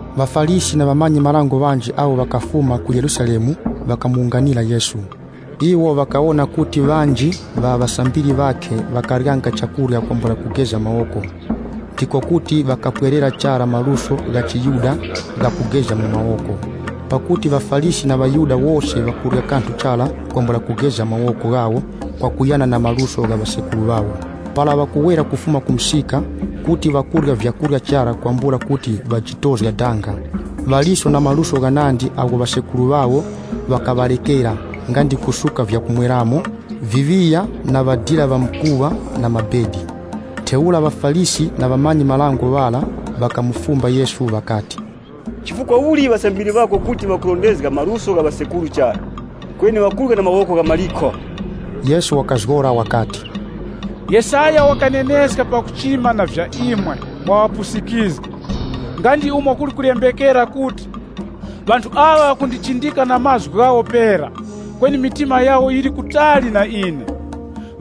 ŴaFarisi na ŵamanyi-marango ŵanji awo ŵakafuma ku Yerusalemu ŵakamuwunganira Yesu. Iwo ŵakawona kuti ŵanji ŵa ŵasambiri ŵakhe ŵakaryanga chakurya kwambula kugeza mawoko, ndiko kuti ŵakapwererako chara maluso gha chiYuda gha kugeza mu mawoko. (Pakuti ŵaFarisi na ŵaYuda wose ŵakurya kanthu chara kwambula kugeza mawoko ghawo kwakuyana na maluso gha ŵasekuru ŵawo. Para ŵakuwera kufuma ku msika, kuti ŵakurya vyakurya chara kwambula kuti ŵajitozga danga. Ŵaliso na maluso ghanandi agho ŵasekuru ŵawo ŵakaŵarekera nga ndi kusuka vyakumweramo, viŵiya na ŵadira ŵamkuŵa na vitara.) Ntheura ŵaFarisi na ŵamanyi-marango ŵara ŵakamufumba Yesu ŵakati, “Chifukwa uli ŵasambiri ŵako kuti ŵakurondezga maluso gha ŵasekuru chara, kweni ŵakurya na mawoko ghamalikho?” Yesu wakazgora wakati, “Yesaya wakaneneska pakuchima na vya imwe mwa ŵapusikizgi, nga ndi umo kuli kulembekera kuti, ‘Ŵanthu aŵa ŵakundichindika na mlomo wawo pera, kweni mtima wawo uli kutali na ine. (LXX)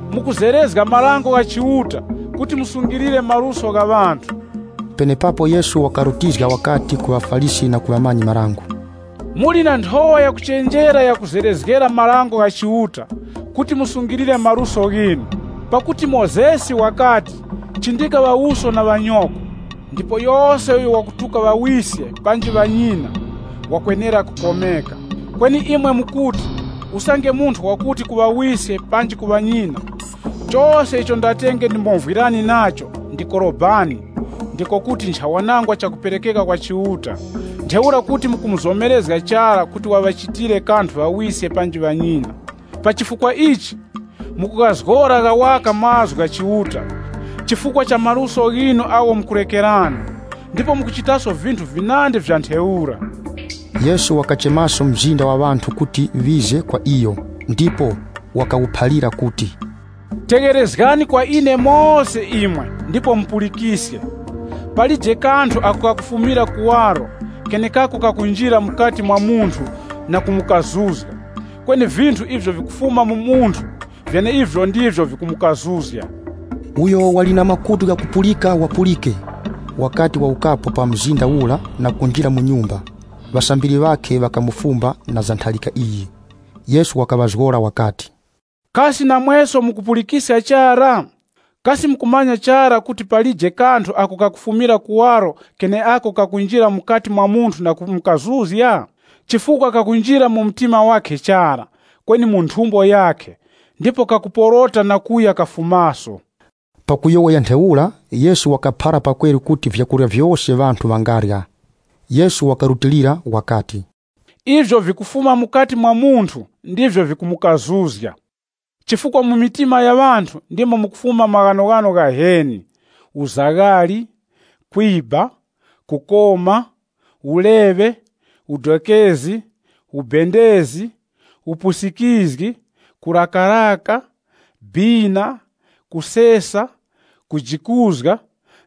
“Mukuzerezga marango gha Chiuta kuti musungilire maluso gha ŵanthu.” Penepapo Yesu wakati ku ŵaFarisi na ku ŵamanyi-marango, “Muli na nthowa yakuchenjera yakuzerezgera marango gha Chiuta mwakuti musungilire maluso ghinu. Pakuti Mozesi wakati, ‘Chindika ŵawuso na ŵanyoko,’ ndipo, ‘Yose uyo wakutuka ŵawiske panji ŵanyina, wakwenera kukomeka.’ Kweni imwe mukuti, usange munthu wakuti ku ŵawiske panji ŵanyina, chose icho ndatenge ndimovwirani nacho ndi Korobani (ndiko kuti nchawanangwa chakuperekeka kwa Chiuta.) Ntheura kuti mukumuzomerezga chara kuti waŵachitire kanthu ŵawiske panji ŵanyina. Pa chifukwa ichi mukughazgora gha waka mazgu gha Chiuta chifukwa cha maluso ghinu agho mukurekerana. Ndipo mukuchitaso vinthu vinandi vya ntheura.” Yesu wakachemaso mzinda wa ŵanthu kuti ŵize kwa iyo, ndipo wakawuphalira kuti, “Tegherezgani kwa ine mose imwe ndipo mupulikiske. Palije kanthu ako kakufumira kuwaro kenekako kakunjira mukati mwa munthu na kumukazuzga. Kweni vinthu ivyo vikufuma mu munthu vyeneivyo ndivyo vikumukazuzga.” [ Uyo wali na makutu ghakupulika, wapulike!] Wakati wawukapo pa mzinda ura na kunjira mu nyumba, ŵasambiri ŵakhe ŵakamufumba na za ntharika iyi. Yesu wakaŵazgora wakati, “Kasi namweso mukupulikiska chara? Kasi mukumanya chara kuti palije kanthu ako kakufumira kuwaro keneako kakunjira mukati mwa munthu na kumukazuzga? Chifukwa kakunjira mu mtima wakhe chara, kweni mu nthumbo yakhe ndipo kakuporota na kuya kafumira ku thondo.” (Pakuyowoya ntheura, Yesu wakaphara pakweru kuti vyakurya vyose ŵanthu ŵangarya.) Yesu wakarutilira wakati, “Ivyo vikufuma mukati mwa munthu ndivyo vikumukazuzga. Chifukwa mu mitima ya ŵanthu ndimo mukufuma maghanoghano ghaheni: uzaghali kwiba, kukoma, uleŵe, udokezi, ubendezi, upusikizgi, kurakaraka, bina, kusesa, kujikuzga,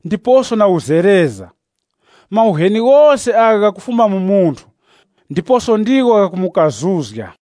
ndiposo na uzereza. Mauheni ghose agha ghakufuma mu munthu, ndiposo ndigho ghakumukazuzga.”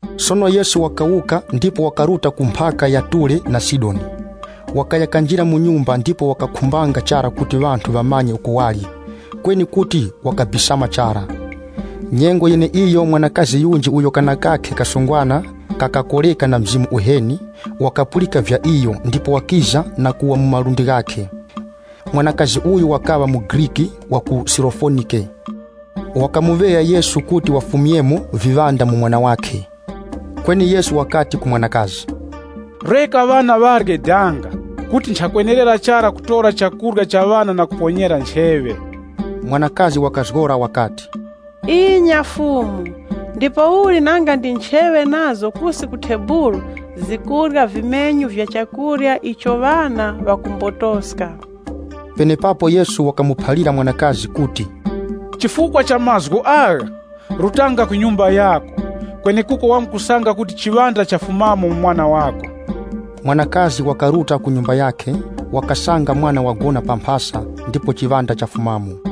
Sono Yesu wakawuka ndipo wakaruta ku mphaka ya Ture na Sidoni. Wakaya kanjira mu nyumba ndipo wakakhumbanga chara kuti ŵanthu ŵamanye uko wali, kweni kuti wakabisama chara. Nyengo yeneiyo, mwanakazi yunji uyo kana kakhe kasungwana wakakoreka na mzimu uheni, wakapulika vya iyo ndipo wakiza na kuwa mu malundi ghakhe. Mwanakazi uyu wakaŵa muGriki wa ku Sirofonike. Wakamuŵeya Yesu kuti wafumyemo viŵanda mu mwana wakhe. Kweni Yesu wakati ku mwanakazi, “Reka ŵana ŵarye danga, kuti nchakwenerera chara kutora chakurya cha ŵana na kuponyera ncheŵe.” Mwanakazi wakazgora wakati, “Inya Fumu, ndipouli nanga ndi ncheŵe nazo kusi ku thebulu, zikurya vimenyu vya chakurya icho ŵana ŵasidako.” Penepapo Yesu wakamuphalira mwanakazi kuti, “Chifukwa cha mazgu agha, rutanga ku nyumba yako, kwenekuko wamkusanga kuti chiŵanda chafumamo mu mwana wako.” Mwanakazi wakaruta ku nyumba yakhe, wakasanga mwana wagona pa chitara, ndipo chiŵanda chafumamo.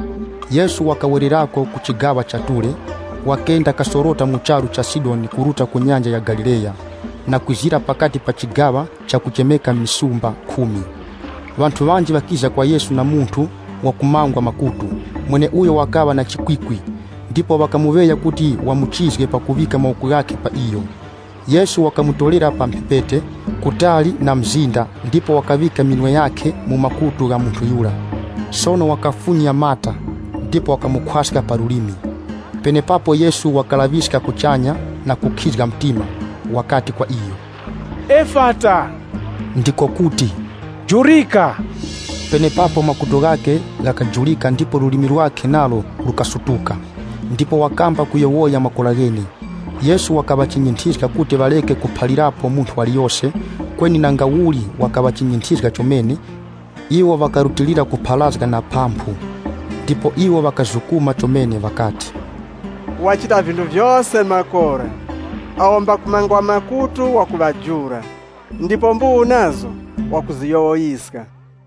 Yesu wakawerako ku chigaŵa cha Ture, wakenda kasorota mu charu cha Sidoni kuruta ku Nyanja ya Galileya na kwizira pakati pa chigaŵa chakuchemeka Misumba Khumi. Ŵanthu ŵanji ŵakiza kwa Yesu na munthu wakumangwa makutu, mweneuyo wakaŵa na chikwikwi, ndipo ŵakamuŵeya kuti wamuchizge pakuŵika mawoko ghakhe pa iyo. Yesu wakamutorera pa mphepete, kutali na mzinda ndipo wakaŵika minwe yakhe mu makutu gha munthu yura. Sono wakafunya mata ndipo wakamukhwaska pa lulimi. Penepapo Yesu wakalaŵiska kuchanya na kukhizga mtima, wakati kwa iyo, “Efata!”, ndiko kuti, “Jurika!” Penepapo makutu ghakhe ghakajurika ndipo lulimi lwakhe nalo lukasutuka. Ndipo wakamba kuyowoya makora ghene. Yesu wakaŵachinyinthizga kuti ŵareke kuphalirapo munthu waliyose. Kweni nangauli wakaŵachinyinthizga chomene, iwo ŵakarutilira kupharazga na phamphu. Ndipo iwo ŵakazukuma chomene ŵakati, “Wachita vinthu vyose makora, awo mbakumangwa makutu wakuŵajula, ndipo mbuwu nazo zikuziyowoyeska.”